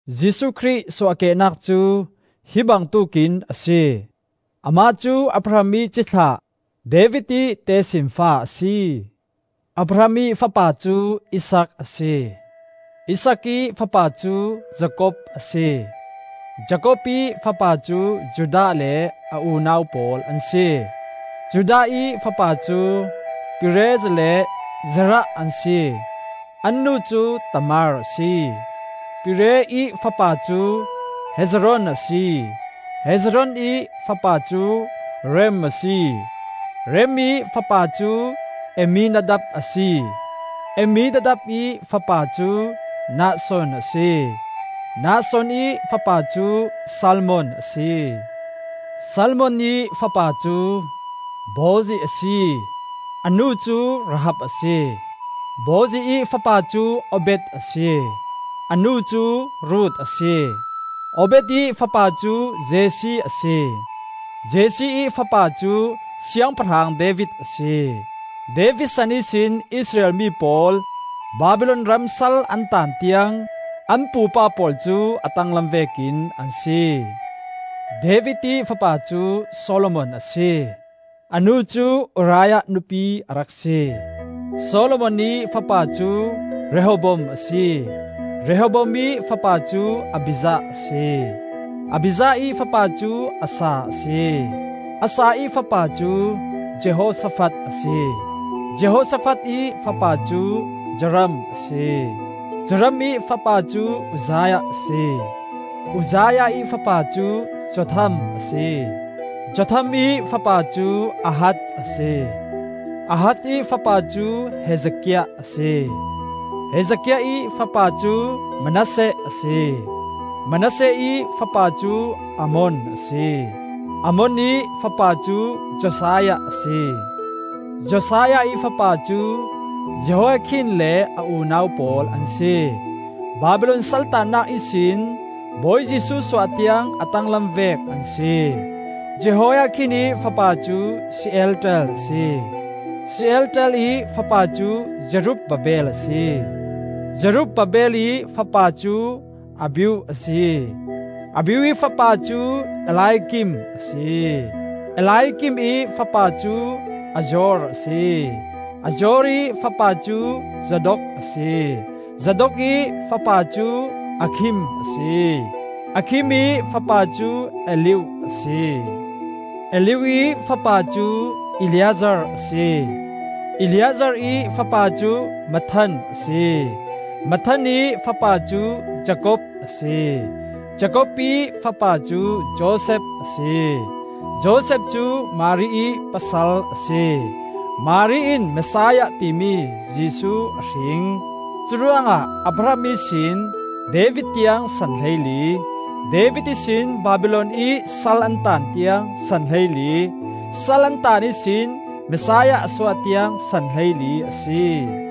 Jesuh Khrih suahkehnak cu hi bangtuk in a si. Amah cu Abraham ih cithlah David ih tesinfa a si. Abraham ih fapa cu Isaak a si. Isaak ih fapa cu Jakob a si. Jakob ih fapa cu Judah le a unau pawl an si. Judah ih fapa cu Perez le Zerah an si (an nu cu Tamar a si), Perez ih fapa cu Hezron a si, Hezron ih fapa cu Ram a si, Ram ih fapa cu Amminadab a si, Amminadab ih fapa cu Nahshon a si, Nahshon ih fapa cu Salmon a si, Salmon ih fapa cu Boaz a si (a nu cu Rahab a si), Boaz ih fapa cu Obed a si (a nu cu Ruth a si), Obed ih fapa cu Jesse a si. Jesse ih fapa cu siangpahrang David a si. David san ihsin Israel mi pawl Babilon ram sal an taan tiang an pupa pawl cu a tanglam vekin an si. David ih fapa cu Solomon a si (a nu cu Uriah nupi a rak si.) Solomon ih fapa cu Rehoboam a si, Rehoboam ih fapa cu Abijah a si, Abijah ih fapa cu Asa a si. Asa ih fapa cu Jehoshafat a si, Jehoshafat ih fapa cu Joram a si. Joram ih fapa cu Uzziah a si. Uzziah ih fapa cu Jotham a si, Jotham ih fapa cu Ahaz a si, Ahaz ih fapa cu Hezekiah a si, Hezekiah ih fapa cu Manasseh a si, Manasseh ih fapa cu Amon a si, Amon ih fapa cu Josiah a si. Josiah ih fapa cu Jehoiakhin le a unau pawl an si. Babilon saltaannak ihsin Bawi Jesuh suah tiang a tanglam vek an si. Jehoiakhin ih fapa cu Shealtiel a si, Shealtiel ih fapa cu Zerub-babel a si, Zerub-babel ih fapa cu Abiud a si, Abiud ih fapa cu Eliakim a si, Eliakim ih fapa cu Azor a si, Azor ih fapa cu Zadok a si, Zadok ih fa pa cu Akhim a si, Akhim ih fapa cu Eliud a si, Eliud ih fapa cu Eleazar a si, Eleazar ih fapa cu Matthan a si, Matthan ih fapa cu Jakob a si, Jakob ih fapa cu Josef a si, Josef cu Mari ih pasal a si, Mari in Messiah timi Jesuh a hring. Curuangah Abraham ihsin David tiang san hleili, David ihsin Babilon i sal an taan tiang san hleili, sal an taan ihsin Messiah a suah tiang san hleili a si.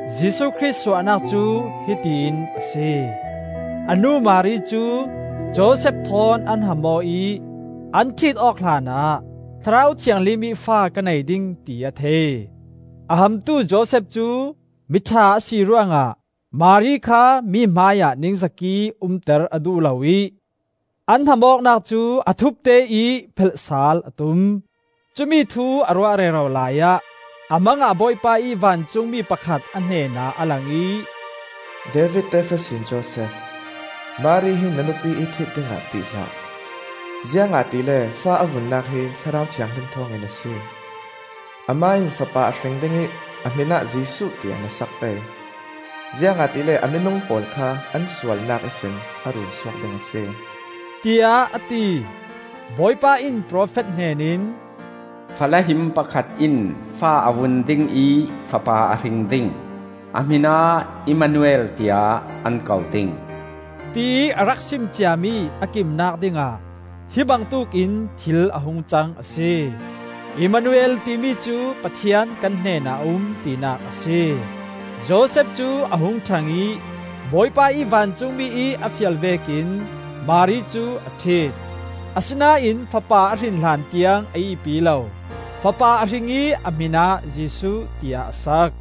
Jesuh Khrih suahnak cu hiti in a si. A nu Mari cu Josef thawn an ham aw ih an ṭhit-awk hlanah Thlarau Thianghlim ih fa ka nei ding ti a thei. A hamtu Josef cu mi ṭha a si ruangah Mari kha mi hmaiah ningzak ih umter a duh lo ih an hamawknak cu a thupte ih phelh saal a tum. Cumi thu a ruah rero laiah a mang ah Bawipa ih vancungmi pakhat a hnenah a lang ih, “David tefa sin Josef, Mari hi na nupi ih ṭhit dingah ṭih hlah. Ziangahtile fa a vunnak hi Thlarau Thianghlim thawngin a si. Amah in fapa a hring ding ih a hmin ah Jesuh tiah na sak pei, ziangahtile a minung pawl kha an sualnak ihsin a run suak ding a si,” tiah a ti. Bawipa in profet hnen in, “Fala him pakhat in fa a vun ding ih fapa a hring ding, a hmin ah Immanuel tiah an ko ding,” tiih a rak sim ciami a kimnak dingah hi bangtuk in thil a hungcang a si. (Immanuel ti mi cu, “Pathian kan hnenah a um,” tinak a si.) Josef cu a hung ṭhang ih, Bawipa ih vancungmi ih a fial vekin Mari cu a ṭhit. Asinain fapa a hrin hlantiang a ihpi lo. Fapa a hring ih a hmin ah Jesuh tiah a sak.